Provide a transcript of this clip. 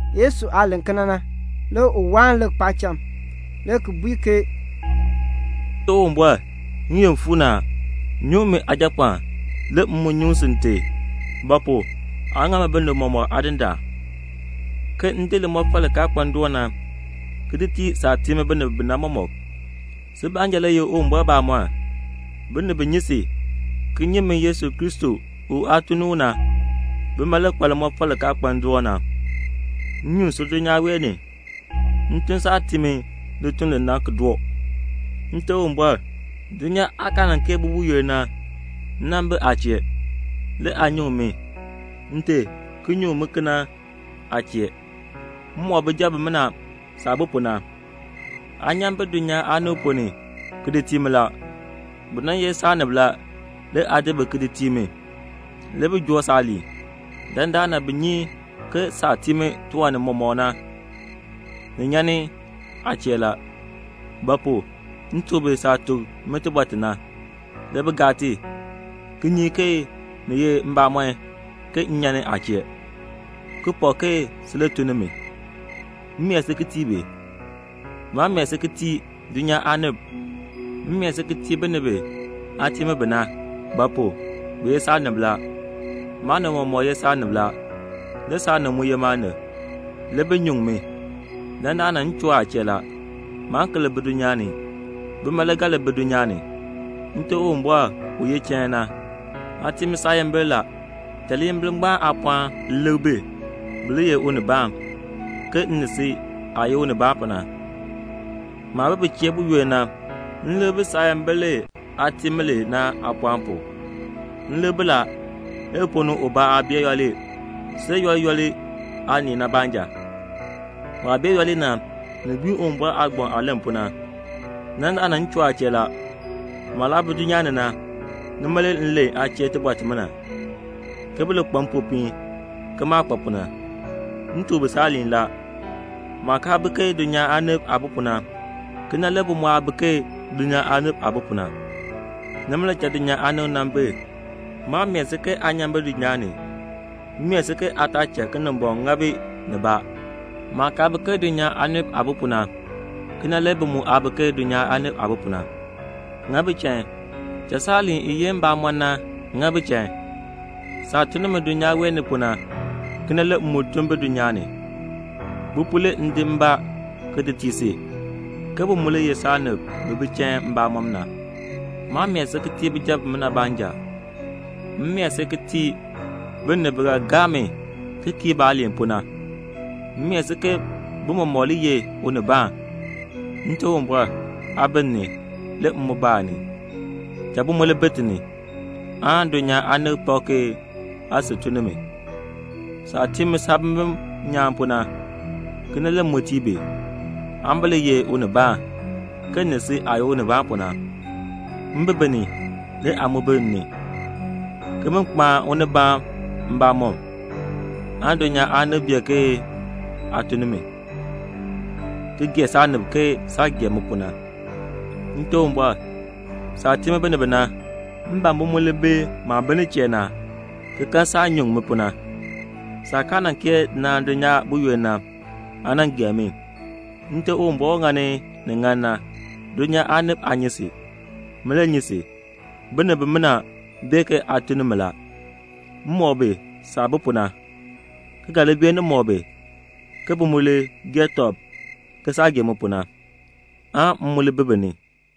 Yesu aah len kena na, le u waan lik paacham, le ki bui ke "Nte Uwumbɔr, n-yoonn fuu ni a. Nyuŋ min Aajapɔɔn, le m mu nyuŋ si Nte; ba pu? aa ŋa mi binib mɔmɔk Aadindaan, ke m di limɔfal li kaa kpa ndoon na, ki di tii saah tii mi binib bi na mɔmɔk. Si baanja le ye Uwumbɔr bamɔnn. Binib bi nyi si, ki nyi mi Yesu Kristo u aa tun ni u na, bima le kpa limɔfal li kaa kpa ndoon na. M nyuŋ si dulnyaa wee ni; m tun saah tii mi lituln li na ki doo. Nte Uwumbɔr, dulnyaa aah kaa nan kee bi buyoonn na, m nan bi aa chee, le aa nyuŋ mi. Nte, ki nyuŋ mi kena aa chee. "M mɔk bijab bimina saah bi pu na. Aa nyan bi dulnyaa aanib ponn ni ki di tii mi la. Bi nan ye saanib la, le aa di bi ki di tii mi. Le bi joo saaliin. Dandana bi nyi ke saah tii mi tiwan nimɔk na, ni nyan ni aa chee la; ba pu? m tuk bi saah tuk mi tibɔr ti na, le bi gaa ti, ki nyi ke ni ye mbamɔn ke m nyan ni aa chee, ki pak ke si le tun ni mi. "M mee si ki tii bi. Maa mee si ki tii dulnyaa aanib. M mee si ki tii binib bi aa tii mi bi na; ba pu? bi ye saanib la. Maanib mɔmɔk ye saanib la. Le saanib mu ye maanib. Le bi nyuŋ mi. Dandana m choo aa chee la. Maan ki li bi dulnyaa ni; bima le ga li bi dulnyaa ni. Nte Uwumbɔr u ye chain na, aa tii mi saayimbil la. Cha liyimbil ngbaan aapɔɔn li lik bi, bi li ye unibaan, ke m ni si aah ye unibaan pu na. Maah bi bi chee buyoonn na, m lik bi saayimbil li aa tii mi li na aapɔɔn pu. M lik bi la, le bi ponn ni ubaa aa bee yooli, see yooli yooli aanii na baanja. Waah bee yooli na, ni gbiin Uwumbɔr aagbaŋ aah len pu na. Dandana m choo aa chee la. Maah laa bi dulnyaa ni na, nima le m len aa chee tibɔr timina, ke bi li kpa mpopiin ke maah kpa pu na. M tuk bi saaliin la. Maah kaa bi ke dulnyaa aanib aah bi pu na, kena le bi mu aa bi ke dulnyaa aanib aah bi pu na. Nima le cha dulnyaa aanib nan bi. Maa mee si ke aa nyan bi dulnyaa ni. M mee si ke aa taa cha Kinimbɔŋ ŋa bi nibaa. Maah kaa bi ke dulnyaa aanib aah bi pu na, kena le bi mu aa bi ke dulnyaa aanib aah bi pu na. Ŋa bi chain. Cha saaliin i ye mbamɔn na, ŋa bi chain. Saah tun ni mi dulnyaa wee ni pu na, kena le m mu tun bi dulnyaa ni. Bi pu le m di mbaa ki di tii si, ke bi mu li ye saanib bi bi chain mbamɔm na. "Maa mee si ki tii bijab bimina baanja. M mee si ki tii binib bi ga gaa mi ki kii baaliin pu na. M mee si ke bi mɔmɔk li ye unibaan. Nte Uwumbɔr, aa bi m ni, le m mu bi aa ni. Cha bi mu li bi ti ni, aan dulnyaa aanib pak ke aa sil tun ni mi. Saah tii mi saabimbin nyaan pu na, kena le m mu tii bi, aan bi li ye unibaan, ke m ni si aah ye unibaan pu na. M bi bi ni, le aa mu bi m ni, ke bin kpaan unibaan mbamɔm, aan dulnyaa aanib bee ke aa tun ni mi, ki gee saanib ke saah gee mi pu na. "Nte Uwumbɔr, saah tii mi binib bi na, m ban bi mu li bi maah bi nin chee na, ki kan saah nyuŋ mi pu na; saah kaa nan kee naan dulnyaa buyoonn na, aa nan gee mi. Nte Uwumbɔr u ŋani ni ŋan na, dulnyaa aanib aa nyi si. Min le nyi si. Binib bimina bee ke aa tun ni mi la. M mɔk bi saah bi pu na, ki ga li beenin mɔk bi, ke bi mu li gee tɔb ke saah gee mi pu na, aan m mu li bi bi ni."